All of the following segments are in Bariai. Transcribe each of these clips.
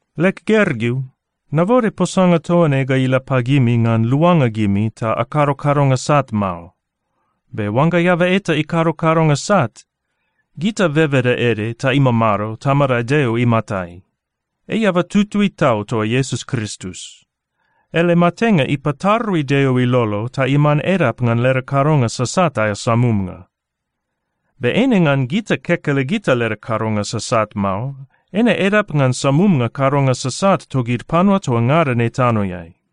Leg gergeu, nabode posanga toa ne ga ila pagimi ngan luanga gimi ta akado kadonga sat mao. Be oangga eaba eta ikado kadonga sat, gita bebeda ede ta imamado Tamada Deo imatai. Ei eaba tutui tau toa Iesus Kristus. Ele matenga ipatarui Deo ilolo ta iman edap ngan leda kadonga sasat aea samumnga. Be eine ngan gita kekelegita leda kadonga sasat mao. Eine edap ngan samumnga kadonga sasat togid panua toa ngada ne tanoeai.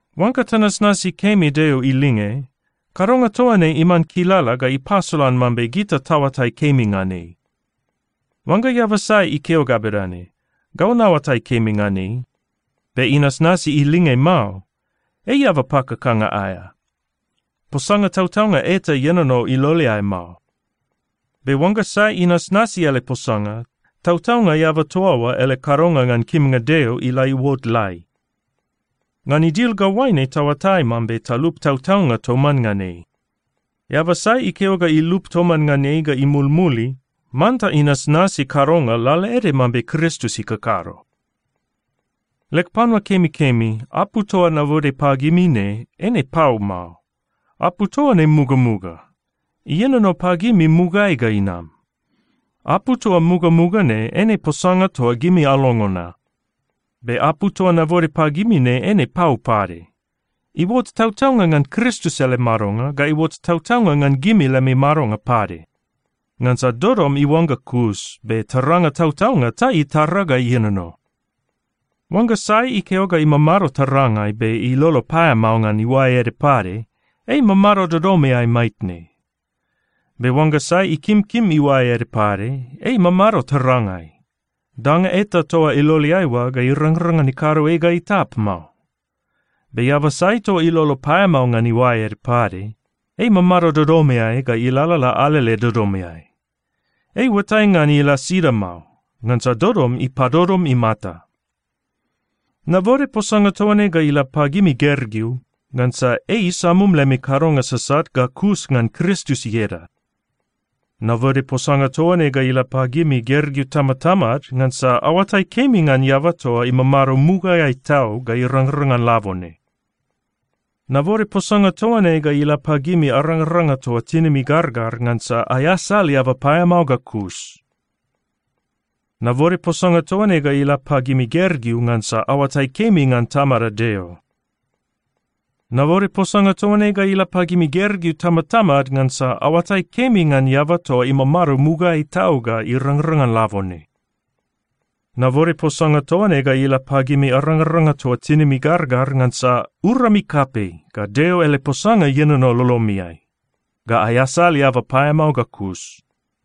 Oangga tanasnasi kemi Deo ilinge, kadonga toa ne iman kilala ga ipasolan mambe gita taoatai kemi ngan ei. Oangga eaba sai ikeo ga bedane, “Gau naoatai kemi ngan ei,” be inasnasi ilinge mao, ei eaba pakakanga aea. Posanga tautaunga eta ienono iloleai mao. Be oangga sai inasnasi ele posanga, tautaunga eaba toa oa ele kadonga ngan kimnga Deo ila iuot lai. Ngan idil ga oaine taoatai mambe talup tautaunga toman ngan ei: Eaba sai ikeo ga ilup toman ngan ei ga imulmuli, manta inasnasi kadonga lalaede mambe Kristus ikakado. Leg panua kemikemi, apu toa nabode pagimi ne, eine pau mao. Apu toa ne mugamuga. Ienono pagimi mugaeai ga inam. Apu toa mugamuga ne eine posanga toa gimi alongo na. Be apu toa nabode pagimi ne eine pau pade. Iuot tautaunga ngan Kristus ele madonga ga iuot tautaunga ngan gimi lemi madonga pade. Ngansa dodom iuangga kus. Be taranga tautaunga ta itara ga ienono. Oangga sai ikeo ga imamado tarangai, be ilolo paeamao ngan iuae ede pade, ei imamado dodomeai maitne. Be oangga sai ikimkim iuae ede pade, ei imamado tarangai. Danga eta toa iloleai oa ga irangrang ngan ikado ei ga itap mao. Be eaba sai toa ilolo paeamao ngan iuae ede pade, ei imamado dodomeai ga ilalala alele dodomeai. Ei iuatai ngan ila sida mao, ngansa dodom ipadodom imata. Nabode posanga toa ne ga ila pagimi gergeu, ngansa ei isamum lemi kadonga sasat ga kus ngan Kristus ieda. Nabode posanga toa ne ga ila pagimi gergeu tamatamad, ngansa aoatai kemi ngan eaba toa imamado mugaeai tau ga irangrang ngan labone. Nabode posanga toa ne ga ila pagimi arangaranga toa tinimi gargar, ngansa aeasal eaba paeamao ga kus. Nabode posanga toa ne ga ila pagimi gergeu, ngansa aoatai kemi ngan Tamada Deo. Nabode posanga toa ne ga ila pagimi gergeu tamatamad, ngansa aoatai kemi ngan eaba toa imamado mugaeai tau ga irangrang ngan labone. Nabode posanga toa ne ga ila pagimi arangaranga toa tinimi gargar, ngansa urami kapei, ga Deo ele posanga ienono lolomiai, ga aeasal eaba paeamao ga kus.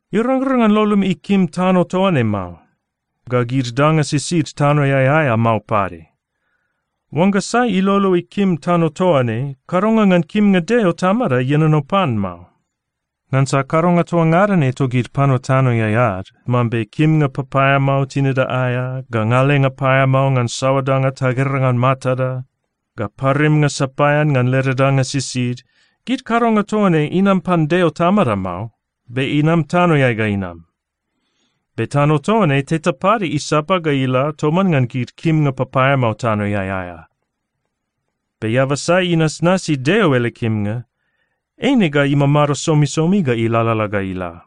Irangrang ngan lolomi ikim tano toa ne mao, ga gid danga sisid tanoeai aea mao pade. Oangga sai ilolo ikim tano toa ne, kadonga ngan kimnga Deo Tamada ienono pan mao. Ngansa kadonga toa ngada ne togid panua tanoeai ad, mambe kimnga papaeamao tinida aea, ga ngalenga paeamao ngan saoa danga tagera ngan matada, ga parimnga sapaean ngan leda danga sisid, gid kadonga toa ne inam pan Deo Tamada mao, be inam tanoeai ga inam. Be tano toa ne teta pade isapa ga ila toman ngan gid kimnga papaeamao tanoeai aea. Be eaba sai inasnasi Deo ele kimnga, eine ga imamado somisomi ga ilalala ga ila.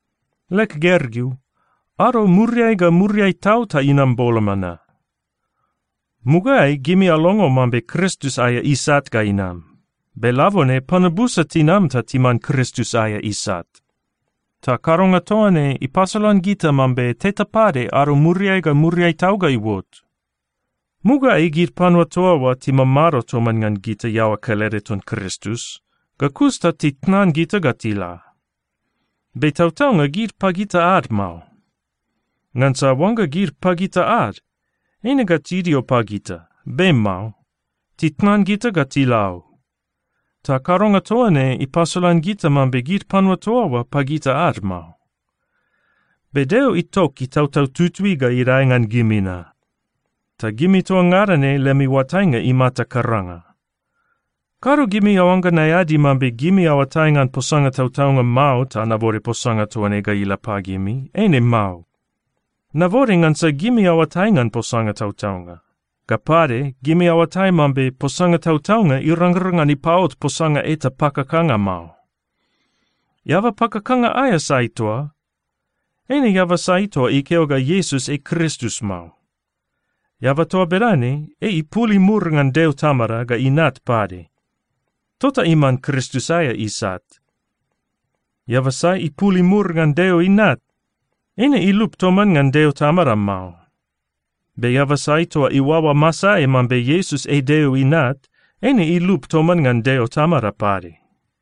Leg gergeu, ado muriai ga muriai tau ta inam boloma na. Mugaeai gimi alongo mambe Kristus aea isat ga inam, be labone panua busa tinam ta timan Kristus aea isat. Ta kadonga toa ne ipasolan gita mambe teta pade ado muriai ga muriai tau ga iuot. Mugaeai gid panua toa oa timamado toman ngan gita iaoa kelede ton Kristus, ga kus ta titnan gita ga tila. Be tautaunga gid pagita ad mao. Ngansa oangga gid pagita ad, eine ga tidio pagita. Be mao. Titnan gita ga tila o. Ta kadonga toa ne ipasolan gita mambe gid panua toa oa pagita ad mao. Be Deo itok Itautau Tutui ga idae ngan gimi na. Ta gimi toa ngada ne lemi oatainga imata karanga. Kado gimi aoangga naeadi mambe gimi aoatai ngan posanga tautaunga mao ta nabode posanga toa ne ga ila pagimi. Eine mao. Nabode ngansa gimi aoatai ngan posanga tautaunga. Ga pade, gimi aoatai mambe posanga tautaunga irangrang ngan ipaot posanga eta pakakanga mao. Eaba pakakanga aea sai toa? Eine eaba sai toa ikeo ga Iesus ei Kristus mao. Eaba toa bedane, ei ipul imur ngan Deo Tamada ga Inat pade. Tota iman Kristus aea isat. Eaba sai ipul imur ngan Deo Inat, eine ilup toman ngan Deo Tamada mao. Be eaba sai toa iuaoa masaeai mambe Iesus ei Deo Inat, eine ilup toman ngan Deo Tamada pade.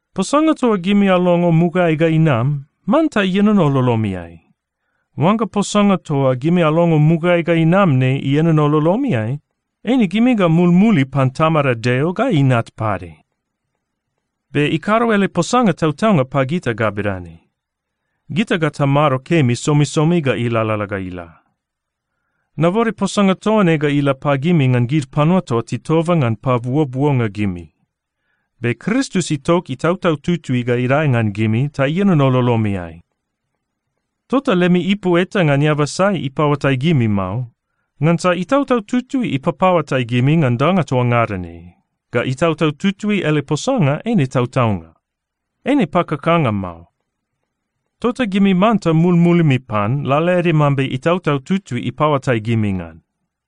Posanga toa gimi alongo mugaeai ga inam, manta ienono lolomiai. Oangga posanga toa gimi alongo mugaeai ga inam ne ienono lolomiai, eine gimi ga mulmulimi pan Tamada Deo ga Inat pade. Be ikado ele posanga tautaunga pagita ga bedane: Gita ga tamado kemi somisomi ga ilalala ga ila. Nabode posanga toa ne ga ila pagimi ngan gid panua toa titoba ngan pabuobuonga gimi. Be Kristus itok Itautau Tutui ga idae ngan gimi ta ienono lolomiai. Tota lemi ipu eta ngan eaba sai ipaoatai gimi mao. Ngansa Itautau Tutui ipapaoatai gimi ngan danga toa ngada ne, ga Itautau Tutui ele posanga eine tautaunga. Eine pakakanga mao. Tota gimi manta mulmulimi pan, lalaede mambe Itautau Tutui ipaoatai gimi ngan.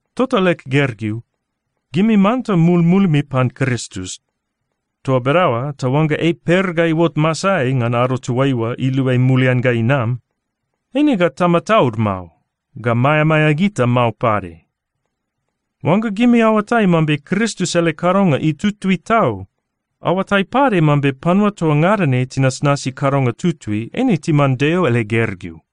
Tota leg gergeu, gimi manta mulmulimi pan Kristus. Toa bedaoa ta oangga ei per ga iuot masaeai ngan ado toaiua iluai mulian ga inam, eine ga tamataud mao, ga maeamaea gita mao pade. Oangga gimi aoatai mambe Kristus ele kadonga itutui tau, aoatai pade mambe panua toa ngada ne tinasnasi kadonga tutui eine timan Deo ele gergeu.